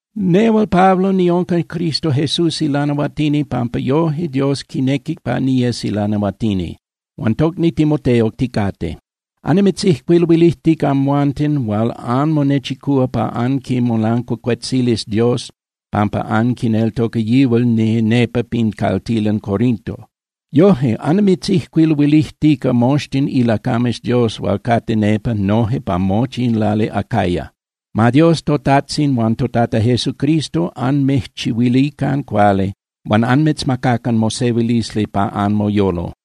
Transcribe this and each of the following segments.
Nehual Pablo niunca Cristo Jesús ilanahuatini pampa yoje Dios quinequic pa niyes ilanahuatini. Huan tocni Timoteo ticate. Annimitzijcuiluilijtica amhuanten hual anmonechicúa pa anquimolancuacuetzilis Dios pampa anquineltoca yihual nepa pin caltilan Corinto. Noje annimitzijcuiluilijtica moxtin ilacames Dios hual cate nepa noje pa mochi in lali Acaya. Ma Dios toTajtzin huan toTata Jesucristo anmijchihuilican cuali huan anmitzmacacan mosehuilisli pa anmoyolo.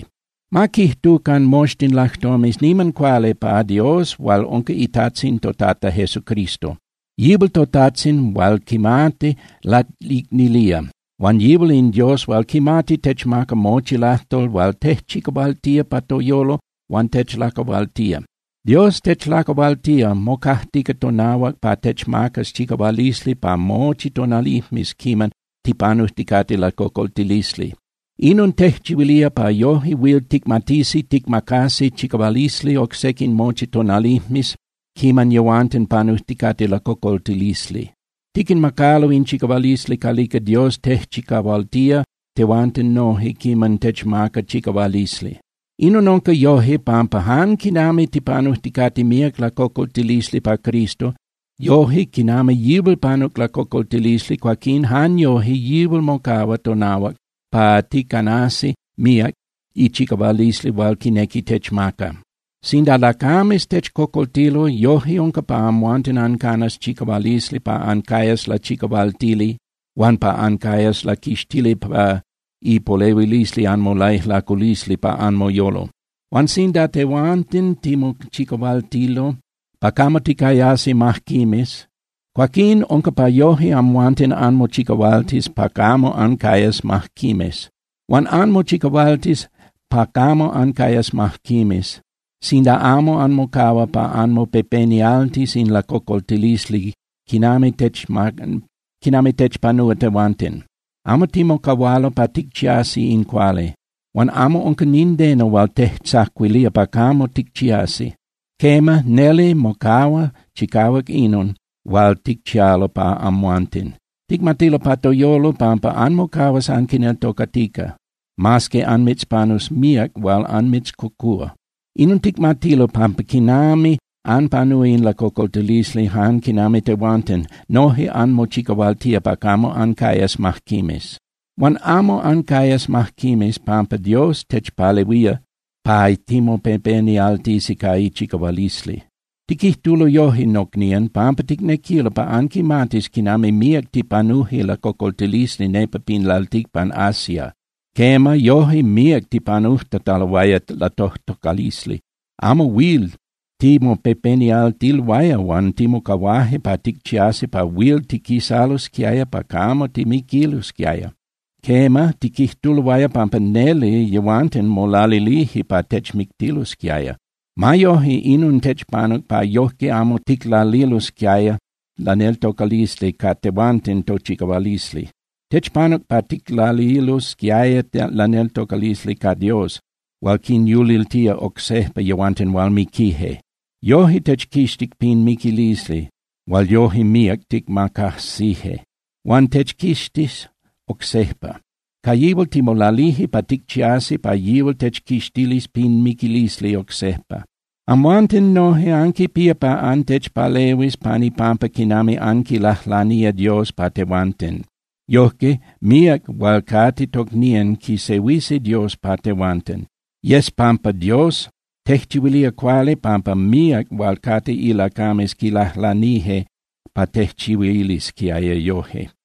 Ma quijtucan moxtin lajtomes niman cuali pa Dios hual unca iTajtzin toTata Jesucristo. Yihual toTajtzin hual quimati laicnilía, huan yihual in Dios hual quimati techmaca mochi lajtol hual tejchicahualtía pa toyolo huan techlacahualtía. Dios techlacahualtía, mocajtica tonahuac pa techmacas chicahualisli pa mochi tonalijmes quiman tipanujticate lacocoltilisli. Inon tejchihuilía pa yoje huil ticmatisi ticmacasi chicahualisli oc sequin mochi tonalijmes quiman yehuanten panujticate lacocoltilisli. Tiquinmacalo in chicahualisli calica Dios tejchicahualtía tehuanten noje quiman techmaca chicahualisli. Inon unca yoje pampa jan quinami tipanujticate míac lacocoltilisli pa Cristo, yoje quinami yihual panuc lacocoltilisli, cuaquín jan yoje yihual mocahua tonahuac pa ticanasi míac ichicahualisli hual quinequi techmaca. Sinda lacames techcocoltilo, yoje unca pa amhuanten ancanas chicahualisli pa ancayas lachicahualtili huan pa ancayas laquixtili pa ipolehuilisli anmolaijlaculisli pa anmoyolo. Huan sinda tehuanten timochicahualtilo pa camo ticayasi majquimes, cuaquín unca pa yoje amhuanten anmochicahualtis pa camo ancayas majquimes. Huan anmochicahualtis pa camo ancayas majquimes sinda amo anmocahua pa anmopepenialtis in lacocoltilisli quinami techpanúa tehuanten. Amo timocahualo pa ticchiasi in cuali, huan amo unca nindeno hual tejtzacuilía pa camo ticchiasi. Quema, neli mocahua chicahuac inon hual ticchialo pa amhuanten. Ticmatilo pa toyolo pampa anmocahuas anquineltocatica, mas que anmitzpanus míac hual anmitzcocúa. Inon ticmatilo pampa quinami anpanúa in lacocoltilisli jan quinami tehuanten, noje anmochicahualtía pa camo ancayas majquimes. Huan amo ancayas majquimes pampa Dios techpalehuía pa timopepenialtisi ca ichicahualisli. Tiquijtulo yoje, nocnían, pampa ticnequilo pa anquimatis quinami míac tipanuje lacocoltilisli nepa pin lalticpan Asia. Quema, yoje míac tipanujtataloaya latojtocalisli, amo huil timopepenialtiloaya huan timocahuaje pa ticchiasi pa huil tiquisalosquiaya pa camo timiquilosquiaya. Quema, tiquijtuloaya pampa neli yehuanten molalilije pa techmictilosquiaya. Ma yoje, inon techpanuc pa yoje amo ticlalilosquiaya laneltocalisli ca tehuanten tochicahualisli. Techpanuc pa ticlalilosquiaya laneltocalisli ca Dios hual quinyuliltía oc sejpa yehuanten hual miquije. Yoje techquixtic pin miquilisli hual yoje míac ticmacajsije. Huan techquixtis oc sejpa. Ca yihual timolalije pa ticchiasi pa yihual techquixtilis pin miquilisli oc sejpa. Amhuanten noje anquipía pa antechpalehuis pan ipampa quinami anquilajlanía Dios pa tehuanten. Yojque, míac hual cate tocnían quisehuisi Dios pa tehuanten. Yes pampa Dios tejchihuilía cuali. Tejchihuilía cuali pampa míac hual cate ilacames quilajlanije pa tejchihuilisquiaya yoje.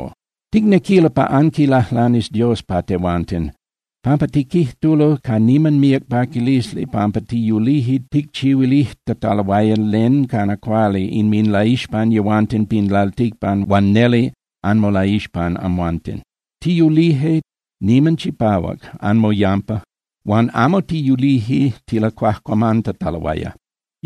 Ticnequilo pa anquilajlanis Dios pa tehuanten, pampa tiquijtulo ca niman míac paquilisli pampa tiyulije ticchihuilijtataloaya len cana cuali inminlaixpan yehuanten pin lalticpan huan neli anmolaixpan amhuanten. Tiyulije niman chipahuac anmoyampa huan amo tiyulije tilacuajcuamantataloaya.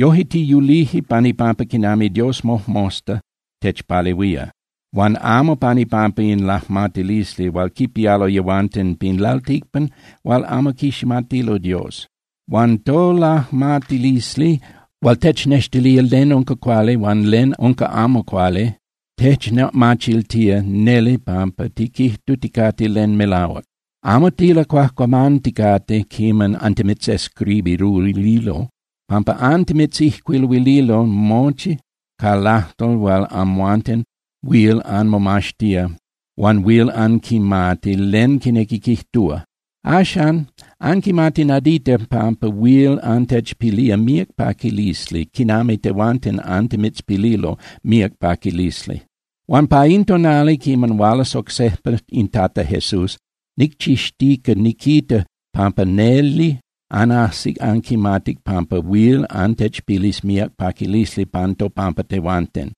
Yoje tiyulije pan ipampa quinami Dios mojmosta techpalehuía, huan amo pan ipampa in lajmatilisli hual quipialo yehuanten pin lalticpan hual amo quiximatilo Dios. Huan tolajmatilisli hual technextilía len unca cuali huan len unca amo cuali techmachiltía neli pampa tiquijtuticate len melahuac. Amo tilacuajcuamanticate quiman antimitzijcuiluililo (antimitzescribiruililo), pampa antimitzijcuiluililo mochi ca lajtol hual amhuanten huil anmomaxtía huan huil anquimati len quinequi quijtúa. Axan anquimati nadita pampa huil antechpilía míac paquilisli quinami tehuanten antimitzpililo míac paquilisli. Huan pa in tonali quiman hualas oc sejpa in Tata Jesús, nicchixtica niquita pampa neli anajsic anquimatic pampa huil antechpilis míac paquilisli pan topampa tehuanten,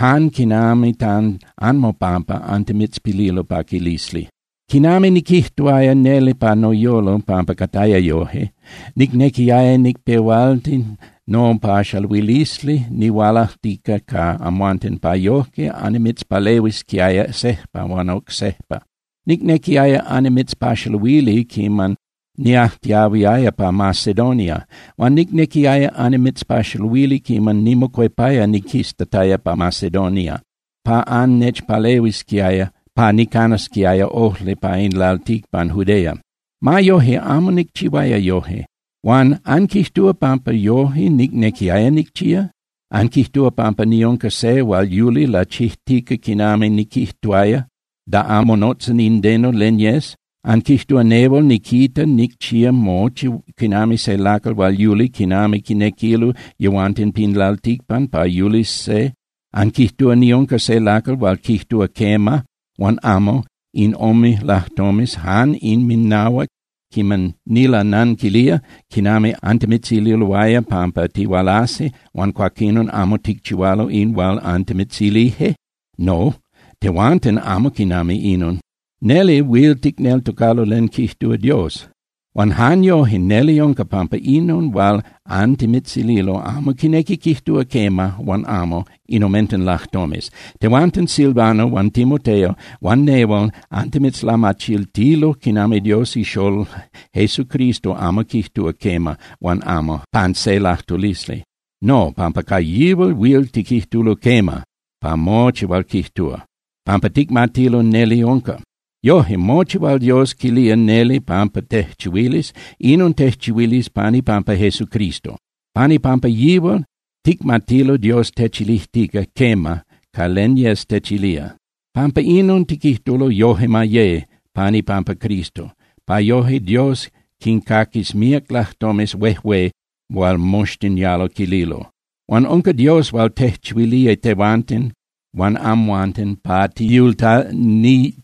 jan quinami pan anmopampa antimitzpililo paquilisli. Quinami niquijtuaya neli pa noyolo pampa cataya yoje, nicnequiaya nicpehualti nopaxaluilisli nihualajtica ca amhuanten pa yojque annimitzpalehuisquiaya sejpa huan oc sejpa. Nicnequiaya annimitzpaxaluili quiman niajtiahuiaya pa Macedonia. Huan nicnequiaya annimitzpaxaluili quiman nimocuepaya niquistataya pa Macedonia pa annechpalehuisquiaya pa nicanasquiaya ojli pa in lalticpan Judea. Ma yoje, amo nicchihuaya yoje. Huan ¿anquijtúa pampa yoje nicnequiaya nicchía? ¿Anquijtúa pampa niunca se hual yuli lachijtica quinami niquijtuaya da amo monotza nindeno len yes? ¿Anquijtúa nehual niquita nicchía mochi quinami se lacal hual yuli quinami quinequilo yehuanten pin lalticpan pa yulis se? ¿Anquijtúa niunca se lacal hual quijtúa “quema” huan “amo” in ome lajtomes jan inminahuac quiman nilananquilía, quinami antimitzililoaya pampa tihualasi huan cuaquinon amo ticchihualo in hual antimitzilije? No, tehuanten amo quinami inon. Neli huil ticneltocalo len quijtúa Dios. Huan jan yoje neli unca pampa inon hual antimitzililo amo quinequi quijtúa “quema” huan “amo” in omenten lajtomes. Tehuanten Silvano huan Timoteo huan nehual antimitzlamachiltilo quinami Dios iXolol Jesucristo amo quijtúa “quema” huan “amo” pan se lajtulisli. No, pampa ca yihual huil tiquijtulo “quema” pa mochi hual quijtúa, pampa ticmatilo neli unca. Yoje, mochi hual Dios quilía neli pampa tejchihuilis, inon tejchihuilis pan ipampa Jesucristo. Pan ipampa yihual, ticmatilo Dios techilijtica “quema” ca len yes techilía. Pampa inon, tiquijtulo “Yoje ma ye” pan ipampa Cristo, pa yoje Dios quincaquis míac lajtomes huejué hual moxtin yalo quililo. Huan unca Dios hual tejchihuilía tehuanten huan amhuanten pa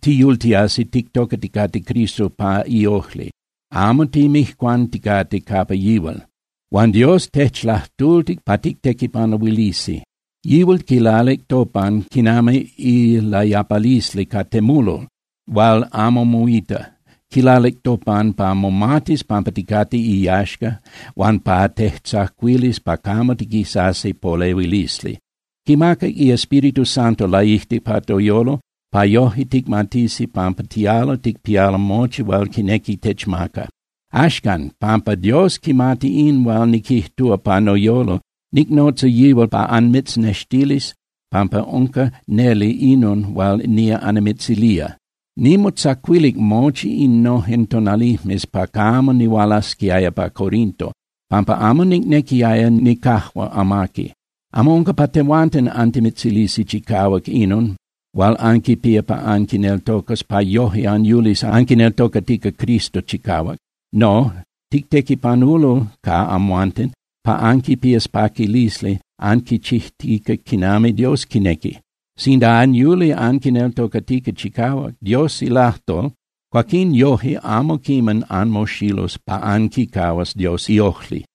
tiyultiasi tictocaticate Cristo pa iojli, amo timijcuanticate capa yihual. Huan Dios techlajtultic pa tictequipanuilisi. Yihual quilalic topan quinami ilayapalisli ca temulol hual amo moita. Quilalic topan pa momatis pampa ticate iyaxca huan pa tejtzacuilis pa camo tiquitasi polehuilisli. Quimacac iEspíritu Santo laijtic pa toyolo pa yoje ticmatisi pampa tialo ticpialo mochi hual quinequi techmaca. Axcan, pampa Dios quimati in hual niquijtúa pa noyolo, nicnotza yihual pa anmitznextilis pampa unca neli inon hual nía annimitzilía: Nimotzacuilic mochi innojen tonalijmes pa camo nihualasquiaya pa Corinto, pampa amo nicnequiaya nicajua amaqui. Amo unca pa tehuanten antimitzilisi chicahuac inon hual anquipía pa anquineltocas pa yoje anyulis anquineltocatica Cristo chicahuac. No, titequipanulo ca amhuanten pa anquipías paquilisli anquichijtica quinami Dios quinequi. Sinda anyuli anquineltocatica chicahuac Dios ilajtol, cuaquín yoje amo quiman anmoxilus pa anquicahuas Dios iojli.